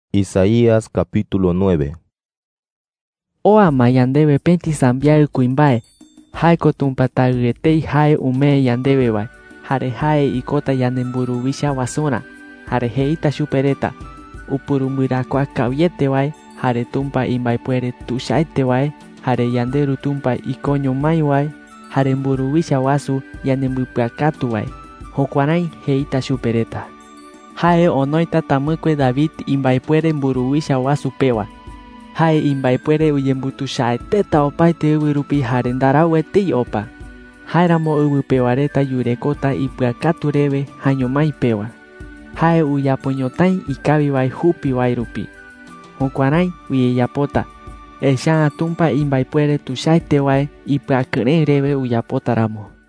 6Oa ma yandewe pëti sambiaɨ kuimbae. Jae ko Tumpa Taɨ etei jae umee yandewe wae. Jare jae ikota yanemburuwicha wasurä. Jare jeita chupe reta: UPURUMBƗARAKUAA KAWIETE WAE, jare TUMPA IMBAEPUERE TUICHAETE WAE, jare YANDERU TUMPA IKOÑO MÁI WAE, jare MBURUWICHA WASU YANEMBƗPƗAKATU WAE. Jukuärái jeita chupe reta. 7Jae onoita tamɨkue David imbaepuere mburuwicha wasu pewa. Jae imbaepuere uyembutuichaeteta opaete ɨwɨ rupi jare ndarau etei opa. Jáeramo ɨwɨ pewa reta yurekota ipɨakatu rewe jaeño mái pewa. Jae uyapo ñotái ikawi wae jupi wae rupi. Jukuärái uyeyapota, echa’ä Tumpa imbaepuere tuichaete wae ipɨakɨrëɨ rewe uyapota ramo.